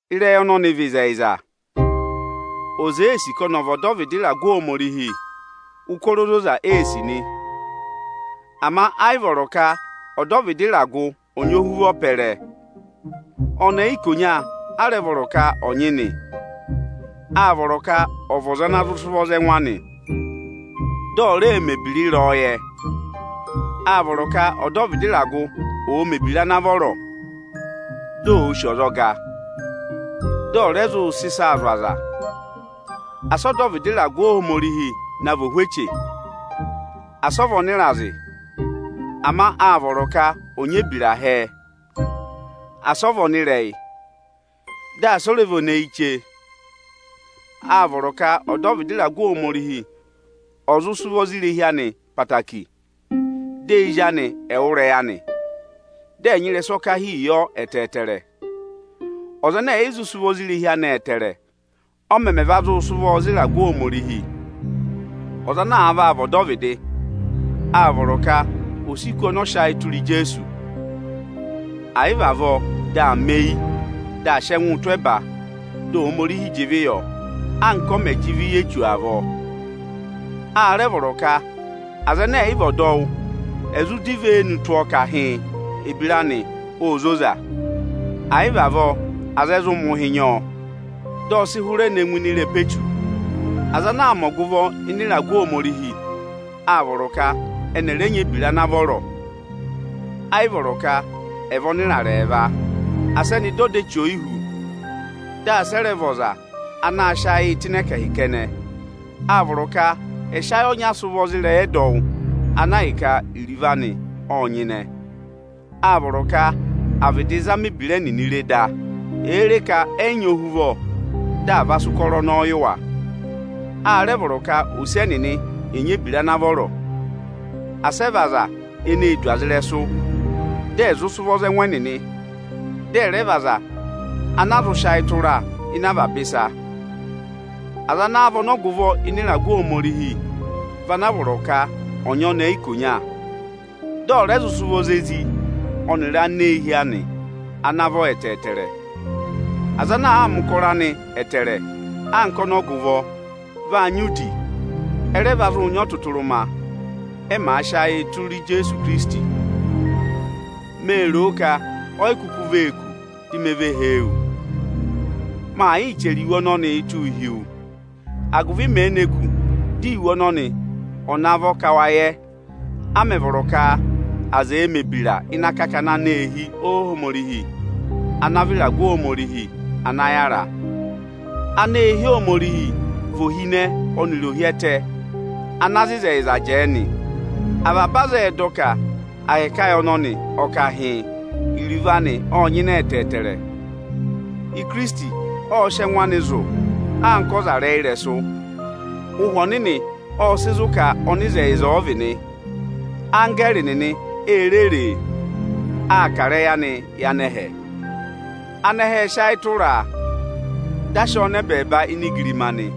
Ịrẹyị ọnọnị vị ịzẹyịza: Ọza èe sì ka ọnị ọ̀ vị ọdọvịdị ịragụ Ohomorihi, ụkọrọ ozoza ee sì nị. Ama ẹ́ yị vọrọ ka ọdọvịdị ịragụ ọ̀ nyị ohuvọ pẹrẹ. Ọnẹẹ ikonya a rẹ vọrọ ka ọ̀ nyị nị. Áa vọrọ ka ọ̀ vị ọza ana zụ sị ụvọ za ẹngụ anị, dị ọ̀ rẹẹ mẹ̀ ebira ịrẹyọyẹ. Áa vọrọ ka ọdọvịdị ịragụ ọ̀ọ mẹ̀ ebira ana vọrọ, dị òo sì ọzọga, dị ọ̀ rẹ zụụ sị ịsaa zụ̀ aza. Asị ọdọvịdị ịragụ Ohomorihi na vị ohweche, asị ọ vị ọnịrazị! Ama áa vọrọ ka ọ̀ nyị ebira hẹẹ, asị ọ vị ọnịrẹyị, dị asị ọ rẹ vị eneyiche! Áa vọrọ ka ọdọvịdị ịragụ Ohomorihi ọ̀ zụ sị ụvọ za irehi anị ẹtẹẹtẹrẹ, dị ezi anị ẹ̀ẹ wụ́ ịrẹyị anị, dị ẹ̀ sị ụbanyị yọ ẹtẹẹtẹrẹ. Ọza ẹnẹ ẹ̀yị zụ sị ụvọ za irehi anị ẹtẹẹrẹ, ọ mẹmẹ va zụụ sị ụvọọ za ịragụ Ohomorihi? Ọza ana vaa vị ọdọvịdị, áa vọrọ ka ò si kù ọnị ọ sị ayị tụra Ijeesu. Àyị vị avọọ, dị aa mẹ eyi, dị aa sị ẹngụụ tụ́ ẹba, dị Ohomorihi jị ịvị yọ, anka ọ mẹ̀ jị ịvị yị Echu avọọ. A rẹ vọrọ ka aza ẹnẹ ẹ̀ yị vị ọdọwụ, ẹ̀ zụ dọ ivenu tụ́ ọọ ka hịịn, ebira anị óo zoza. Àyị vị avọọ, aza ẹ zụ mẹ̀ ụhị nyị ọọ, dị ọ sị hụrẹ ne ngụ ịnị ịrẹpa Echu. Aza ana aa mẹ ọgụvọ ịnị ịragụ Ohomorihi, áa vọrọ ka ẹnị ẹ̀ rẹ nyị ebira ana vọrọ. Ẹ́ yị vọrọ ka ẹ̀ vị ọnịrarẹ ẹẹva. Asị ẹnị dọ ọda eche oyihú, dị asị ẹ rẹ vị ọza anaā sịị ayịị tụ́ ịnị ẹkẹhị kẹnẹ! Áa vọrọ ka ẹ̀ sị ayị ọnya sị ụvọ za ịrẹyị ẹdọwụ ana ahịka iruvo anị ọ́ọ nyịnẹ. Áa vọrọ ka à vịdị zama ebira ẹnịnị re da; èe re ka ẹ́ yị nyị ohuvọ, dị à va sị ụkọrọ ọnọọ yị wa. A rẹ vọrọ ka ose ẹnịnị ẹ̀ nyị ebira ana vọrọ. Asị ẹ vị aza eneē du aza ịrẹsụ, dị ẹ̀ zụ sị ụvọ za ẹngụ ẹnịnị, dị ẹ̀ rẹ vị aza ana a zụ sị ayị tụra ịnị avaba ịsa. Aza ana vị ọnọgụvọ ịnị ịragụ Ohomorihi vị ana a vọrọ ka ọ̀ nyị ọnẹẹ ikonya, dị ọ̀ rẹ zụ sị ụvọ za ezi ọnịrị aneehi anị ana vọ ẹtẹẹtẹrẹ. Aza ana àa mẹ̀ ụkọrọ anị ẹtẹẹrẹ anka ọnọgụvọ, vaa nyị udi; ẹ rẹ va zụụ nyị ọtụtụrụma, ẹ màa sị ayịị tụra Ijeesu Ikirisiti. Mee ro ka oyi kuku vee kù, di me ve hee wu. Maa yịị chẹrẹ iwe ọnọnịị tụ́ụ hi wu, agụvị mèe ne kù, dị iwe ọnọnị ọ̀ navọ ka wa yẹ, a mẹ̀ vọrọ ka aza ẹ̀ẹ mẹ̀ ebira ịnị akakana aneehi Ohomorihi ana vị ịragụ Ohomorihi ana yára. Aneehi Ohomorihi vị ohinẹ ọnịrị ohyẹtẹ ana za ịzẹyịza jẹẹ nị. Avaba aza ẹ́ẹ dọ ka ahẹkẹ ayị ọnọnị, ọ ka hịịn, iruvo anị ọ́ọ nyịnẹ ẹtẹẹtẹrẹ: Ikirisiti ọ́ọ sị ẹngụ anị zụ̀ anka ọzarẹyịrẹsụ. Ụhwẹ Ọnịnị ọ́ọ sị zụ̀ ka ọnịzẹyịza ọ vị nị, anggẹẹrị nịnị e re ree. Áa kà ịrẹyị anị yị anẹhẹ, anẹhẹ ẹ́ẹ sị ayị tụra, dị a sị ọọ nọ ẹbẹẹba ini igirima nị.